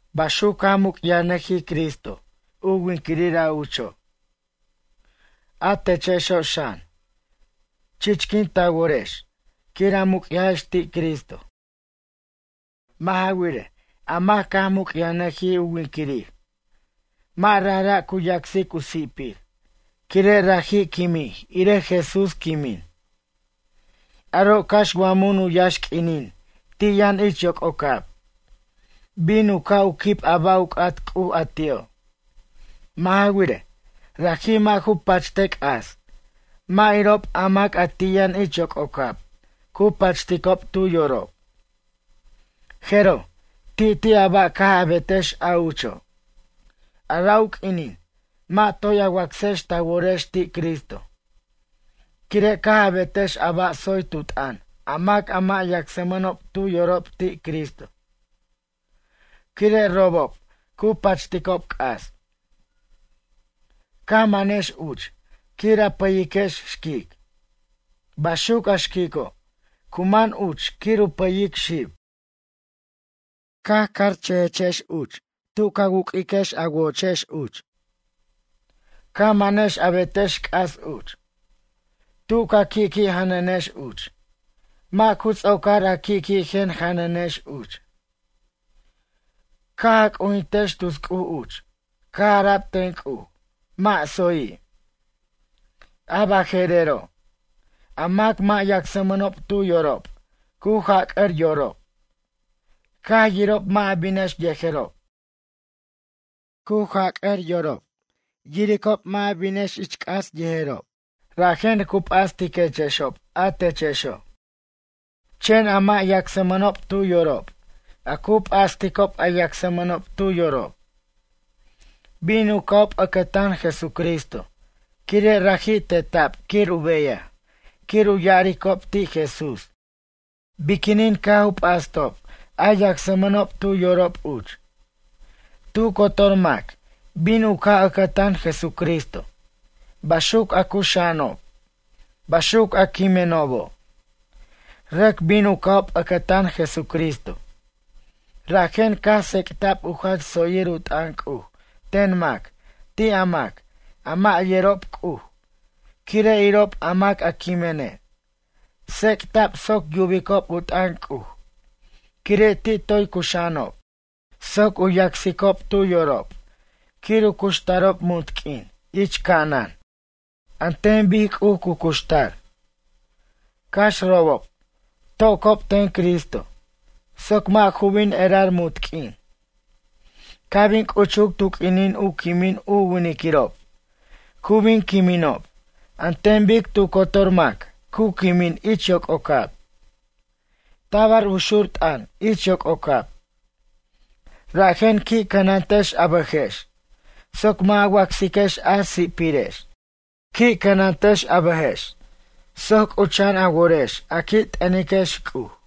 Baxuc caj muc'yajnʌjij Cristo u winquirir ucho'. A techexo' xan, chichquin ta worex quir a muc'yajex ti' Cristo. Mʌ' ja wirej, a mac caj muc'yajnʌjij u winquirir, mʌ' rajra' u yacsic u si'pir quire' raji' quimij irej Jesús quimin. Aro' cax wa mun u yaxq'uinin ti' yʌn ich yoc'ocab, bin u ca' u quib a ba' u c'at C'uj a ti'o'. Mʌ' ja wirej, raji' mʌ' ju pachte c'as mʌ' irob a mac a ti' yʌn ich yoc'ocab cu pachticob tu yorob. Jeroj, ti'ti' a ba' caj a betex a ucho', a ra' u q'uinin mʌ' toy a wacsex ta worex ti' Cristo, quire' caj a betex a ba' tsoy tu t'ʌn a mac a mʌ' yacsmʌnob tu yorob ti' Cristo. Quire' robob cu pachticob c'as. Ca manex uch quir a pʌyiquex xquic. Baxuc a xquico', cu man uch quir u pʌyic xib. Caj carchʌjechex uch tu ca wuq'uiquex a woch trago uch. Ca manex a betex c'as uch. Tu ca qui' qui' janʌnex uch, mʌ' ju ts'ocar a qui' qui' jen janʌnex uch. Caj a c'ujintex tus c'uj uch caj ara'b ten C'uj mʌ' tsoyi'. A baje'rero', a mac mʌ' yacsmʌnob tu yorob cu jac'ʌr yorob, caj yirob mʌ' a binex yejerob. Cu jac'ʌr yorob yiricob mʌ' a binex ich c'as yejerob rajen cu p'astiquechexob a techexo'. Chen a mʌ' yacsmʌnob tu yorob, a cu p'asticob a yacsmʌnob tu yorob. Bin u ca'ob ʌcʌtan Jesucristo quire' raji' teta'b quir u beyaj quir u ya'aricob ti' Jesús biquinin caj u p'astob a yacsmʌnob tu yorob uch. Tu cotor mac bin u ca' ʌcʌtan Jesucristo, baxuc a cuxa'anob, baxuc a quiminobo'. Rʌc bin u ca'ob ʌcʌtan Jesucristo. Rajen caj tsec'ta'b u jach tsoyir u t'ʌn C'uj ten mac ti' a mac, a mʌ' yerob C'uj quire' irob a mac a quimene'. Tsec'ta'b soc yubicob u t'ʌn C'uj quire' ti' toy cuxa'anob soc u yacsicob tu yorob quir u cuxtarob munt q'uin ich ca'anan an ten bic C'uj cu cuxtar. Cax robob to'cob ten Cristo soc mʌ' ju bin erar munt q'uin. Ca' bin c'uchuc tu q'uinin u quimin u winquirirob cu bin quiminob an ten bic tu cotor mac cu quimin ich yoc'ocab. Tabar u xu'r u t'ʌn ich yoc'ocab. Rajen qui' cʌnantex a bʌjex soc mʌ' a wacsiquex a si'pirex. Qui' cʌnantex a bʌjex soc c'ucha'an a worex a qui' t'ʌniquex C'uj.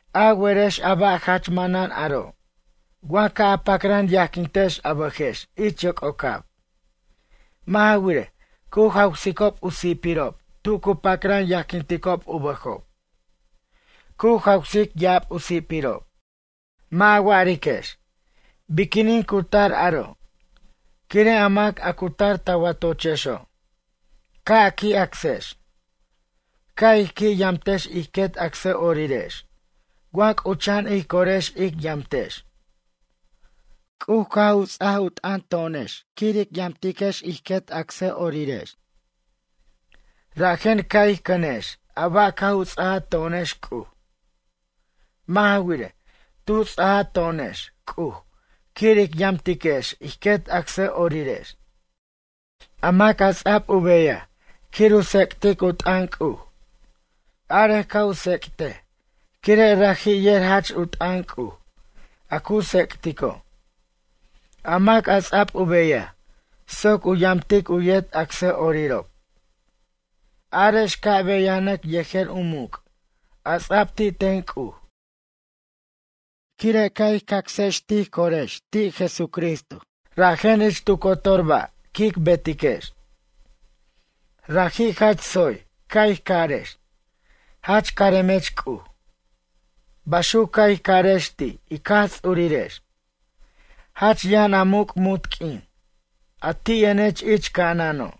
A werex a ba' jach manʌn aro' wa ca' a pacran yajquintex a bʌjex ich yoc'ocab. Mʌ' ja wirej, cu jawsicob u si'pirob tu cu pacran yajquinticob u bʌjob. Cu jawsic ya'ab u si'pirob. Mʌ' a wa'ariquex: “Biquinin cu tar aro'?” Quire' a mac a cu tar ta watochexo', ca' a qui' acsex. Ca' ij qui' yamtex ij quet acsʌ'orirex wa c'ucha'an ij corex ic yamtex. C'uj caj u ts'aj u t'ʌn to'onex quir ic yamtiquex ij quet acsʌ'orirex. Rajen ca' ij c'ʌnex a ba' caj u ts'aj to'onex C'uj. Mʌ' ja wirej, tu ts'aja to'onex C'uj quir ic yamtiquex ij quet acsʌ'orirex. A mac a ts'a'b u beyaj quir u tsec'tic u t'ʌn C'uj. Arej ca' u tsec'tej quire' raji' yer jach u t'ʌn C'uj a cu tsec'tico'. A mac a ts'a'b u beyaj soc u yamtic u yet acsʌ'orirob. Arex ca' beyanʌc yejer u muc' a ts'a'b ti' ten C'uj. Quire' caj ij cacs tij corex ti' Jesucristo rajen ich tu cotor ba' quic betiquex. Raji' jach tsoy ca' ij carex: “Jach caremech C'uj.” Baxuc, ca' ij carex ti' ic Jaj Ts'urirex. “Jach yʌn a muc' munt q'uin, a ti' yʌnech ich ca'anano'.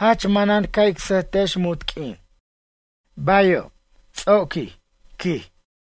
Jach manan ca' ic sʌjtech munt q'uin.” Bayo', ts'oquij, quij.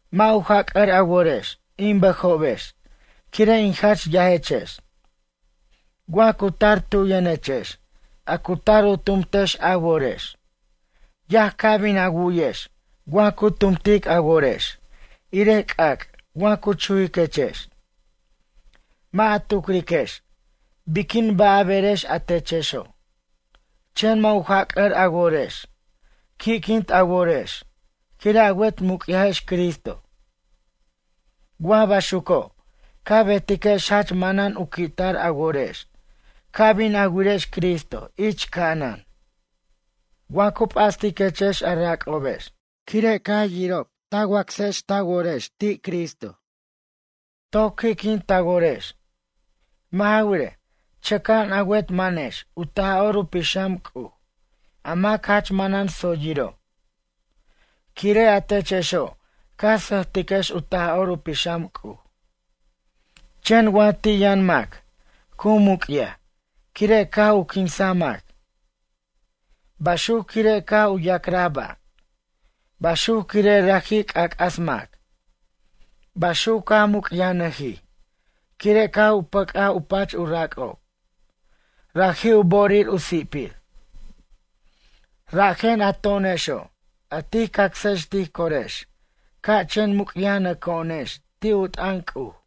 Mʌ' u jac'ʌr a worex, in bʌjobex quire' in jach yajechex. Wa cu tar tu yʌnechex a cu tar u tumtex a worex. Yaj ca' bin a wu'yex wa cu tumtic a worex, irej c'ac' wa cu chujiquechex. Mʌ' a tucriquex biquin ba' a berex a techexo'. Chen mʌ' u jac'ʌr a worex. Qui'quint a worex quire' a wet muc'yajex Cristo. Wa baxuco', ca betiquex jach manan u qui'tar a worex ca' bin a wirex Cristo ich ca'anan. Wa cu p'astiquechex a rac'obex quire' caj yirob a wacsex ta worex ti' Cristo. Toc qui'quint ta worex. Mʌ' ja wirej, chʌca'an a wet manex u Taj'or u Pixam C'uj, a mac jach manan tsoyiro'. Quire' a techexo' ca sʌjtiquex u Taj'or u Pixam C'uj. Chen wa ti' yʌn mac cu muc'yaj quire' caj u quinsaj mac. Baxuc quire' caj u ya'craj ba'. Baxuc quire' raji' c'ac'as mac. Baxuc caj muc'yajnʌjij quire' caj u pʌc'aj u pach u rac'ob, raji' u bo'orir u si'pir. Rajen a to'onexo' a tij cacsex tij corex ca' chen muc'yajnʌco'onex ti' u t'ʌn C'uj.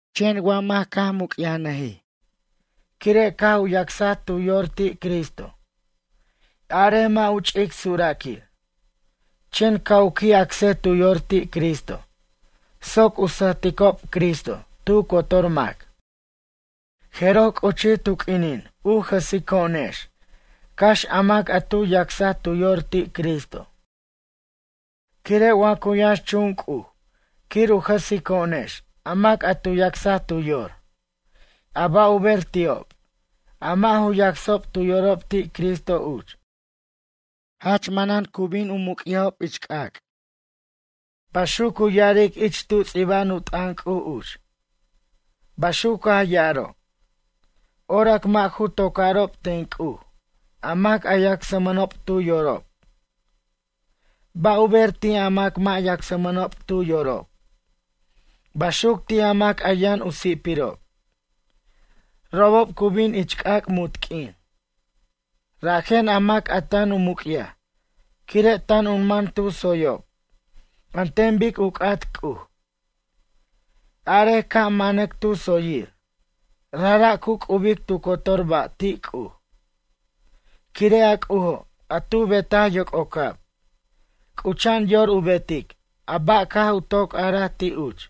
Chen wa mac caj muc'yajnʌjij quire' caj u yacsaj tu yor ti' Cristo. Arej mʌ' u ch'ic suraquir. Chen ca' u qui' acsej tu yor ti' Cristo soc u sʌjticob Cristo tu cotor mac. Jeroj c'uchij tu q'uinin u jʌsico'onex cax a mac a tu yacsaj tu yor ti' Cristo. Quire' wa cu yʌnxchun C'uj quir u jʌsico'onex a mac a tu yacsaj tu yor. A ba' u ber ti'ob, a mʌ' ju yacsob tu yorob ti' Cristo uch? Jach manan cu bin u muc'yajob c'ac'. Baxuc cu ya'aric ich tu ts'iba'an u t'ʌn C'uj uch. Baxuc caj ya'aro': “Orac mʌ' ju tocarob ten C'uj a mac a yacsmʌnob tu yorob. Ba' u ber ti' a mac mʌ' yacsmʌnob tu yorob? Baxuc ti' a mac a yʌn u si'pirob? Robob cu bin ich c'ac' munt q'uin.” Rajen a mac a tan u muc'yaj quire' tan u man tu tsoyob an ten bic u c'at C'uj. Arej ca' manac tu tsoyir rajra' cu c'ubic tu cotor ba' ti' C'uj. Quire' a C'ujo' a tu betaj yoc'ocab, c'ucha'an yor u betic a ba' caj u toc araj ti' uch.